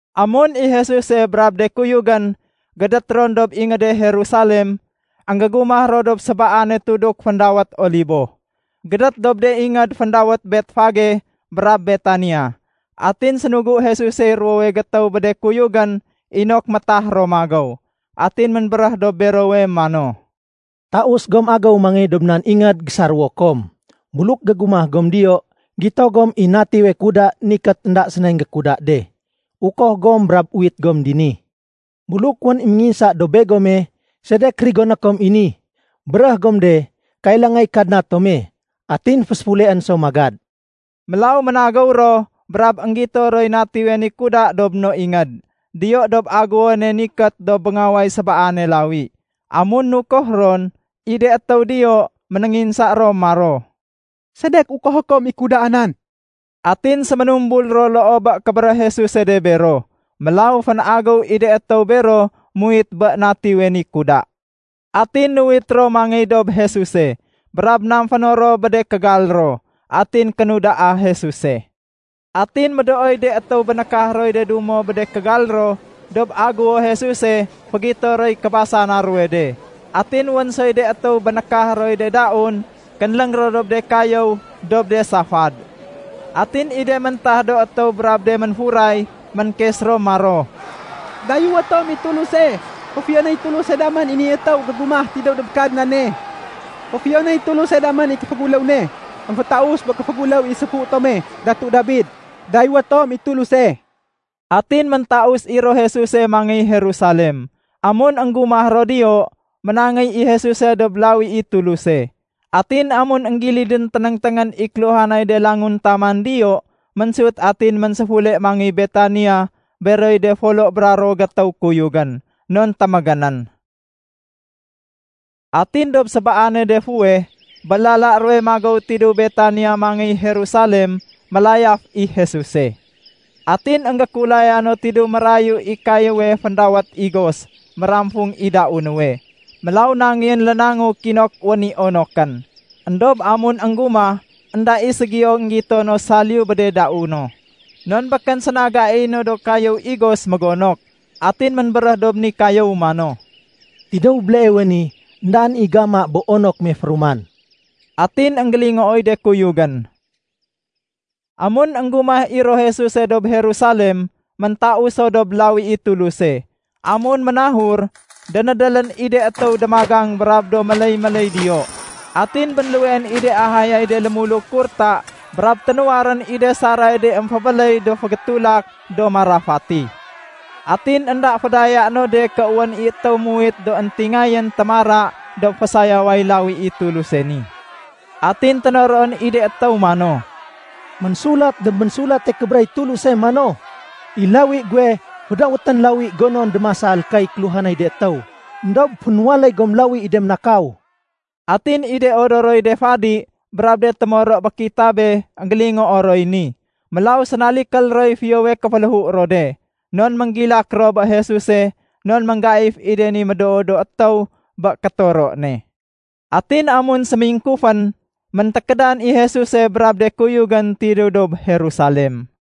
Amun i Jesuse brab de kuyugén gédét ron dob ingéde Jerusalem, énggégumah ro dob sébaane tuduk féndawét Olibo, gédét dob de ingéd féndawét Betfage brab Betania. Atin sénugu Jesusey ruwowe gétéw bé de kuyugén inok métah ro magéw. Atin ménbéréh dob berowe mano, “Taus gom agéw mangéy dob nan ingéd gésaréwo kom. Buluk gégumah gom diyo, gito gom i natiwe kuda nikét, énda sénay énggékuda de. Ukoh gom brab uwit gom dini. Buluk wén i ménginsa dob begome, ‘Sedek rigoné kom i ni?’ béréh gom de, ‘Kailangay Kadna tome, atin féséfuleén so magad.’” Mélaw ménagéw ro brab énggito roy natiwe ni kuda dob no ingéd, diyo dob aguwone nikét dob béngaway sébaane lawi. Amun nukoh ron, i de étéw diyo ménénginsa ro maro, “Sedek ukohé kom i kudaa nan?” Atin séménumbul ro loo bé kébéréh Jesuse de bero. Mélaw fénagéw i de étéw bero muwit bé natiwe ni kuda. Atin nuwit ro mangéy dob Jesuse. Brab namféno ro bé de kégal ro. Atin kénudaa Jesuse. Atin médooy de étéw bénékah roy de dumo bé de kégal ro dob aguwo Jesuse fégito roy kébasana ruwe de. Atin wén soy de étéw bénékah roy de daun kénléng ro dob de kayéw dob de safad. Atin i de méntah do étéw brab de ménfuray, ménkes ro maro, “Dayéwé tom i Tuluse! Féfiyonéy Tuluse damén i ni étéw gégumah tidéw dob Kadnane. Féfiyonéy Tuluse damén i kéféguléw ne émfétaus bé kéféguléw i séfu tome Datu Dabid. Dayéwé tom i Tuluse!” Atin méntaus i ro Jesuse mangéy Jerusalem. Amun énggumah ro diyo, ménangéy i Jesuse dob lawi i Tuluse. Atin amun énggilidén ténéngténgén i kéluhanay de languntaman diyo, ménsut atin ménséfule mangéy Betania beroy de folo bra ruwo gétéw kuyugén, non témégénén. Atin dob sébaane de fuweh, bé lala ruwe magéw tidéw Betania mangéy Jerusalem, mélayaf i Jesuse. Atin énggékulaya no tidéw mérayu i kayéwe féndawét igos méramfung i dau nuwe. Mélaw nangéyén lénangu kinok wén i onokén. Endob amun énggumah, énda i ségiyo énggito no saliyu bé de dau no, non békén séna gaiy no do kayéw igos mégonok. Atin ménbéréh dob ni kayéw mano, “Tidéw béleewe ni, éndaén i géama bé onok me féruman.” Atin énggélingooy de kuyugén. Amun énggumah i ro Jesuse dob Jerusalem, méntaus so dob lawi i Tuluse. Amun ménahur, dénédélén i de étéw démagang brab do méléy-méléy diyo. Atin bénluweén i de ahayay de lémuluk kurta brab ténuwarén i de saray de émfébéléy do fégétulak do marafati. Atin énda fédayaé no de ké wén i étéw muwit do éntingayén témara dob fésayaway lawi i Tuluse ni. Atin ténoroén i de étéw mano, “Ménsulat dob Ménsulate Kébéréh i Tuluse mano, ‘I lawi guwe, fédawétén lawi gonon démasal kay kéluhanay de étéw.’ Endob fénwaléy gom lawi i de ménakaw.” Atin i de odoroy de fadi brab de témoro bé kitabe énggélingoo roy ni. Mélaw sénalikél roy fiyowe kéféléhu ro de. Non ménggilak ro bé Jesuse non ménggaif i de ni médoo do étéw bé kétoro ne. Atin amun sémingkufén, méntékédan i Jesuse brab de kuyugén tidéw dob Jerusalem.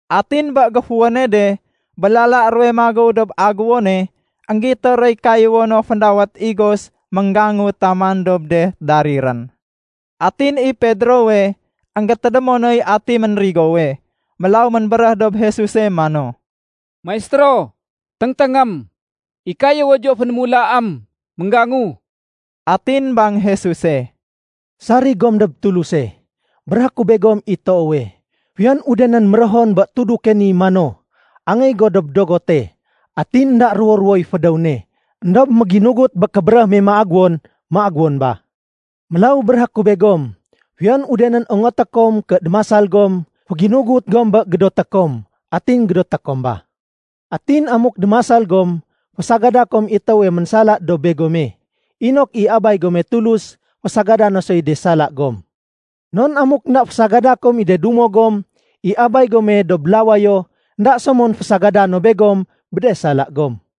Atin bé géfuwéne de, bé lala ruwe magéw dob aguwone, énggito roy kayéwo no féndawét igos ménggangu taman dob de darirén. Atin i Pedrowe, énggétédémo noy ati ménrigowe. Mélaw ménbéréh dob Jesuse mano, “Maistéro, téngténgém. I kayéwo diyo fénémulaém, ménggangu.” Atin bang Jesuse, “Sarig gom dob Tuluse. Béréhé ku begom i toowe, fiyon udenén méréhon bé tuduke ni mano, ‘Angéy go dob dogote’, atin énda ruwo-ruwoy fédéw ne, éndob méginugut bé kébéréh ne méagéwon, méagéwon ba. Mélaw béréhé ku begom, fiyon udenén ongoté kom ké démasal gom, féginugut gom bé gédoté kom, atin gédoté kom ba. Atin amuk démasal gom, fésagada kom i étéwe ménsala dob begome, inok i Abay gome Tulus fésagada no soy de sala gom. Non amuk énda fésagada kom i de dumo gom, i Abay gome dob lawayo, énda so mon fésagada no begom bé de sala gom.”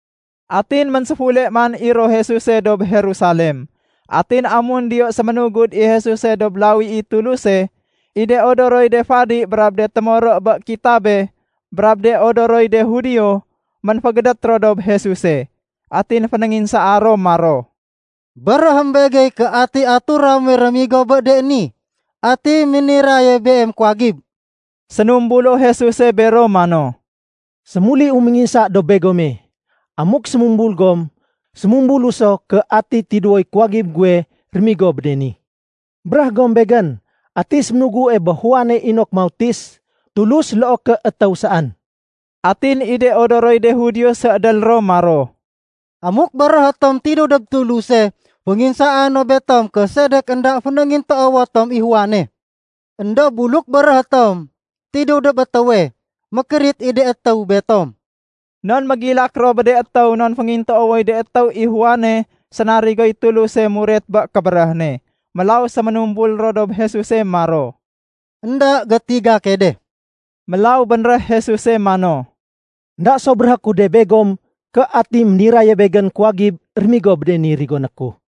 Atin ménséfule man i ro Jesuse dob Jerusalem. Atin amun diyo séménugud i Jesuse dob lawi i Tuluse, i de odoroy de fadi brab de témoro bé kitabe brab de odoroy de Judio, ménfégédét ro dob Jesuse. Atin fénénginsaa ro maro, “Béréhém begey ké ati atura muwe rémigo bé de ni? Ati méniraye Beem kuwagib?” Sénumbulo Jesuse bero mano, “Sémuliu ménginsa dob begome. Amuk sémumbul gom, sémumbulu so ké ati tidéwoy kuwagib guwe rémigo bé de ni. Béréh gom Begén, ati séménugue bé Juane inok mautis, Tulus loo ké étéw saén?” Atin i de odoroy de Judio séédél ro maro, “Amuk béréhé tom ‘Tidéw dob Tuluse’, fénginsaa no betom ké sedek énda fénéngintoowo tom i Juane. Endob buluk béréhé tom, ‘Tidéw dob étéwe’, mékérit i de étéw betom.” Non mégilak ro bé de étéw non féngintoowoy de étéw i Juane sénarigoy Tuluse muret bé kébéréh ne. Mélaw séménumbul ro dob Jesuse maro, “Enda gétiga key de.” Mélaw bénréh Jesuse mano, “Enda so béréhé ku de begom ké ati ménirayane Begén kuwagib rémigo bé de ni rigoné ku.”